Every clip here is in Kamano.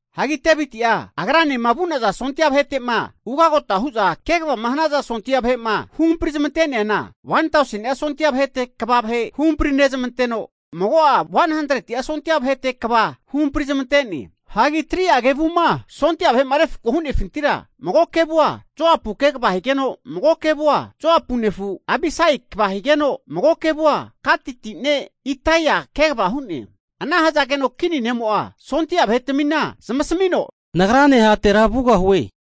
Hagi Deviti'a agranema vu'naza sondia vahete'ma ugagota hu'za kegavama hanaza sondia vahe'ma huhampri zamante'neana 1tauseni'a sondia vahete kva vahe huhampri nezamanteno, mago'a 100'a sondia vahete kva huhampri zamante'ne. Hagi 3'a kevuma sondia vahe'ma refako hu'nefintira, mago kevua Joapu kegava higeno, mago kevua Joapu nefu Abisai kva higeno mago kevu'a Gatiti ne' Itaia kegava hu'ne. Ana hazageno kini ne'mo'a sondia vahetamina zamasamino, nagrane hatera vugahue.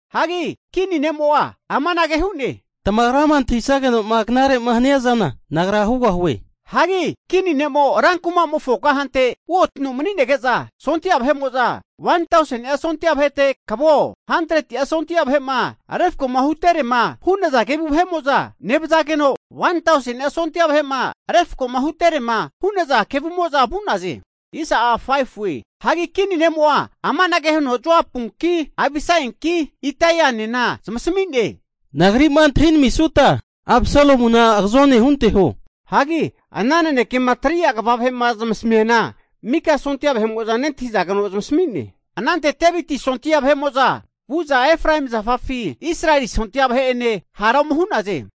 Hagi kini ne'mo'a amanage hu'ne, Tamagrama antahisageno'ma knarema haniazana nagra hugahue. Hagi kini ne'mo rankumamofo kahante uotino mani'nege'za sondia vahe'mo'za 1tauseni'a sondia vahete kvao, 100'a sondia vahe'ma refko'ma hunteterema hu'naza kevu nevazageno, 1tauseni'a sondia vahe'ma refko'ma hunteterema hu'naza kevumo'za vu'naze. Hagi kini ne'mo'a amanage huno Joapunki, Abisainki, Ittainena zamasami'ne, Nagri'ma antahinamisuta Absalomuna agazone hunteho. Hagi ana nanekema 3'a kva vahe'ma zamasamiana mika sondia vahe'mo'za nentahizageno zamasami'ne. Anante Deviti sondia vahe'mo'za vu'za Efraemi zafafi Israeli sondia vahe'ene hara ome hu'naze.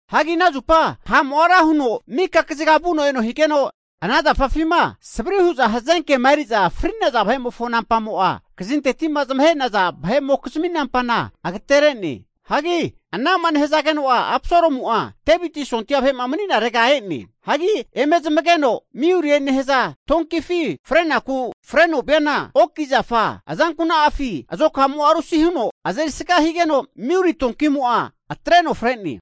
Hagi ana zupa ha'mo'a ra huno maka kaziga vuno eno higeno, ana zafafima savri hu'za hazenkema eri'za fri'naza vahe'mofo nampamo'a kazinteti'ma zamahe'naza vahe'mokizmi nampana agatere'ne. Hagi ana ha'ma nehazageno'a, Absalomu'a Deviti sondia vahe mani'narega e'ne. Hagi eme zamageno miuli nehaza donkifi frenaku freno viana oki zafa azankuna'afi azokamo'a rusi huno azeri sga higeno miuli donkimo'a atreno fre'ne.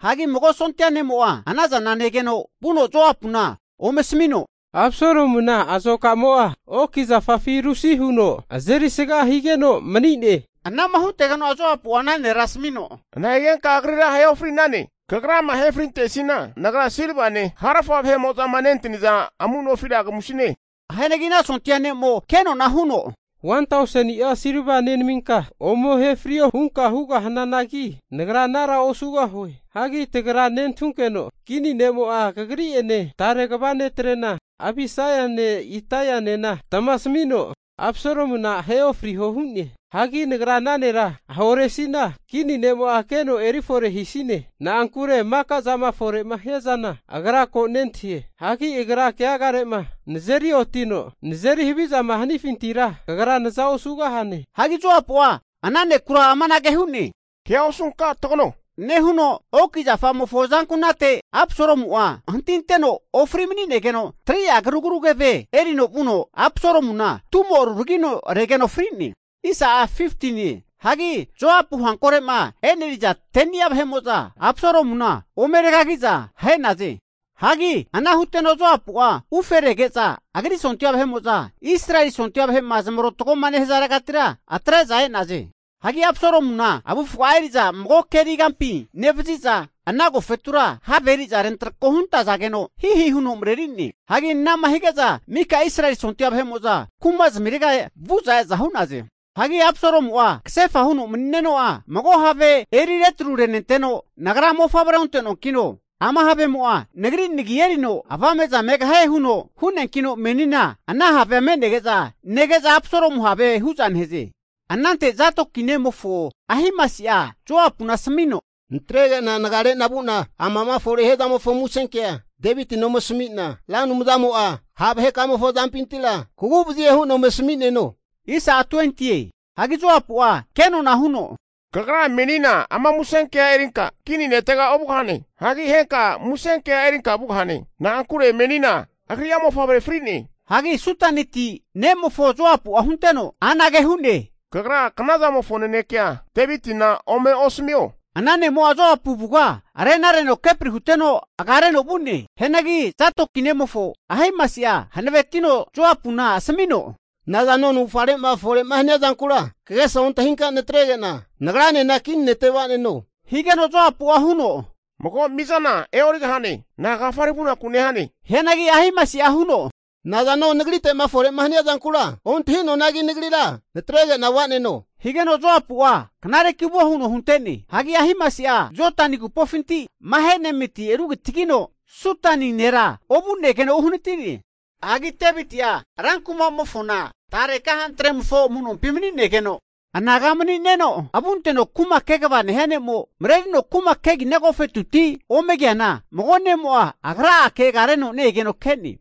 Hagi mago sondia ne'mo'a ana zana negeno vuno Joapuna ome asamino, Absalomuna azoka'mo'a oki zafafi rusi huno azeri sga higeno mani'ne. Ana'ma hutegeno'a Joapua ana nera asamino, nahigenka agrira ahe ofri'nane, kagrama ahe frintesina nagra silvane harafa ma nentaniza amu nofira kamuresine. Hianagi ana sondia ne'mo kenona huno, 1tauseni'a silva nenaminka ome ahe frio hunka hugahananagi, nagra anara osugahue. Hagi tagra nentahukeno kini ne'mo'a kagri'ene tare kva netrena Abisaine Ittainena tamasamino Absalomuna ahe ofriho hu'ne. Hagi nagra ana nera ahoresina, kini ne'mo'a keno eri fore hisine. Na'ankure maka'zama fore hiazana agra ko nentahie. Hagi agra keagare'ma nazeri otino nazeri havizama hanifintira, kagra naza osugahane. Hagi Joapu'a ana nekura amanage hu'ne, Kea osunka tagano, nehuno oki zamofo azanku'nate Absalomu'a hantiteno ofri mani'negeno 3'a karugru keve erino vuno, Absalomuna tumo ruragino regeno fri'ne. Hagi Joapu hankore'ma e'neri'za 10ni'a vahe'mo'za Absalomuna ome regagi'za ahe'naze. Hagi ana huteno Joapu'a uferege'za agri sondia vahe'mo'za Israeli sondia vahe'ma zamarotagoma nehazaregatira atre'za e'naze. Hagi Absalomuna avufga'a eri'za mago keri kampi nevaziza, ana agofetura have eri'za rentrako huntazageno hihi huno mareri'ne. Hagi ana'ma hige'za mika Israeli sondia vahe'mo'za kumazamirega vu'za e'za hu'naze. Hagi Absalomu'a kasefa huno'ma mani'neno'a, mago havea eri retru renenteno nagra mofavre onte'noankino, ama havemo'a nagri nagi erino avame'za megahie, huno hu'neankino menina ana havea me'nege'za nege'za Absalomu have hu'za nehaze. Anante Zadoki nemofo Ahimasi'a Joapuna asamino, natrege'na nagarena vu'na amama fore'ma hia zamofo musenkea kea Devitina ome asamina, Ra Anumzamo'a ha' vahekamofo azampintira kaguvazie hu'na ome asamineno. Hagi Joapu'a kenona huno, Kagra menina ama musenkea erinka kini netega ovugahane. Hagi henka musenkea erinka vugahane. Na'ankure menina agri'a mofavre fri'ne. Hagi Sudaniti (Itiopia) ne'mofo Joapu'a hunteno anage hu'ne, Kagra knazamofo nanekea Devitina ome asamio, ana ne'mo'a Joapu avuga renareno kepri huteno agareno vu'ne. Hianagi Zadoki nemofo Ahimasi'a hanavetino Joapuna asamino, Nazano navufgare'ma fore'ma hania zankura kagesa ontahi natrege'na nagranena kini nete vaneno. Higeno Joapu'a huno, Mago mizana e'origahananki, na'agafare vunaku nehane? Hianagi Ahimasi'a huno, Nazano nagrite'ma fore'ma hania zankura ontahuanagi nagrira natrege'na va'neno. Higeno Joapu'a knareki vuo huno hunte'ne. Hagi Ahimasi'a Jodani agupofinti Mahanaimiti rugitagino Sudani (Itiopia) nera ovu'negeno uhanati'ne. Hagi Deviti'a ran kuma'mofona tare kahantremofo amu'nompi mani'negeno, anaga mani'neno avunteno kuma kegava nehia ne'mo marerino kuma kegina agofetuti ome keana, mago ne'mo'a agra'ake agareno ne-egeno ke'ne.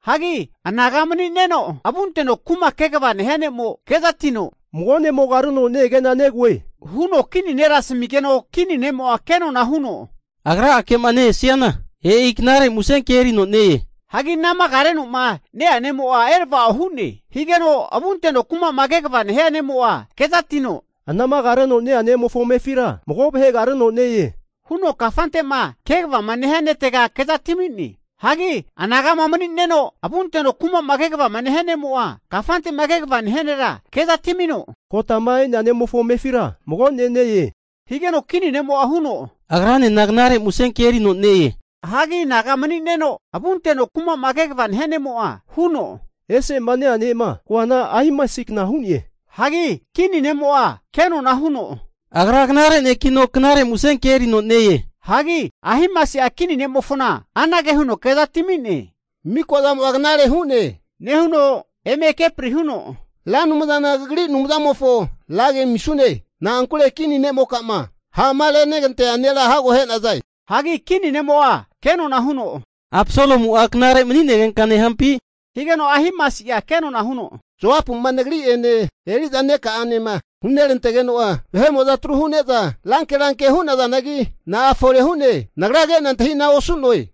Hagi anaga mani'neo avunteno kuma'ma kegava nehia ne'mo'a kezatino, mago ne'mo agareno ne-ege'na negoe, huno kini nera asmigeno, Kini ne'mo'a kenona huno, agra'akema ne-esiana e'i knare musenke erino ne-e. Hagi anama agarenoma nea ne'mo'a erava'o hu'ne. Higeno avunteno kuma'ma kegava nehia ne'mo'a kezatino, Anama agareno ne-ea nemofo amefira mago vahe agareno ne-e, huno kafante'ma kegava nehia netega kezatimine. Hagi anagama mani'neno avunteno kuma'ma kegavama nehia ne'mo'a kafante'ma kegava nehia nera kezatimino, Kotama e'nea ne'mofo amefira mago ne' ne-e, higeno kini ne'mo'a huno, agranena knare musenke erino ne-e. Hagi anaga mani'neno avunteno kuma'ma kegava nehia ne'mo'a huno, Ese'ma ne-ea ne'ma koana Ahimasikna hu'ne. Hagi kini ne'mo'a kenona huno, agra knare nekino knare musenke erino ne-e. Hagi Ahimasi'a kini ne'mofona anage huno kezatimi'ne, Mikazamo'a knare hu'ne, nehuno eme kepri huno Ra Anumzana kagri Anumzamofo ragi amisune. Na'ankure kini ne'mokama ha'ma renegantea nera hago ahe'naze. Hagi kini ne'mo'a kenona huno, Absalomu'a knare mani'negenka nehampi? Higeno Ahimasi'a kenona huno, Joapu'ma nagri'ene eri'za neka'anema hunerantegeno'a vahe'mo'za atru hu'ne'za ranke ranke hu'nazanagi, na'a fore hu'ne nagra ke'na antahi'na osu'noe.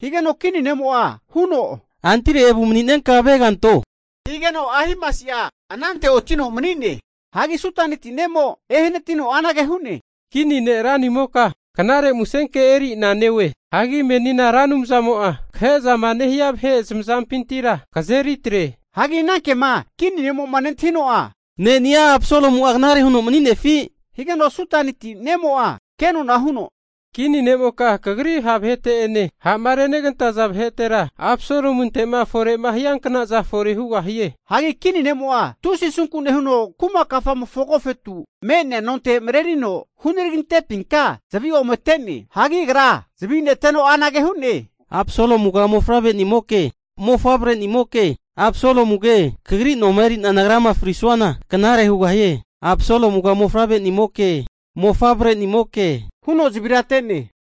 Higeno kini ne'mo'a huno, antire evu mani'nenka avega anto, higeno Ahimasia anante oti'no mani'ne. Hagi Sudaniti (Itiopia) ne'mo ehanatino anage hu'ne, kini ne' ranimoka knare musenke eri'na neoe. Hagi menina Ra Anumzamo'a kahe'zama nehie vahe zamazampintira kazeri atre. Hagi ana kema kini ne'mo'ma nentahino'a, ne'ni'a Absalomu'a knare huno mani'nefi? Higeno Sudaniti (Itiopia) ne'mo'a kenona huno, Kini ne'moka kagri ha' vahete'ene ha'ma renegantaza vahetera, Absalomunte'ma fore'ma hianknaza fore hugahie. Hagi kini ne'mo'a tusi asunku nehuno kuma kafamofo agofetu me'nea nonte marerino hunaragintepinka zavi ome ate'ne. Hagi agra zavi'neteno anage hu'ne, Absalomuga mofavre'nimoke, mofavre'nimoke, Absalomuge, kagri noma eri'na nagrama frisuana knare hugahie, Absalomuga mofavre'nimoke, mofavre'nimoke huno zavira ate'ne.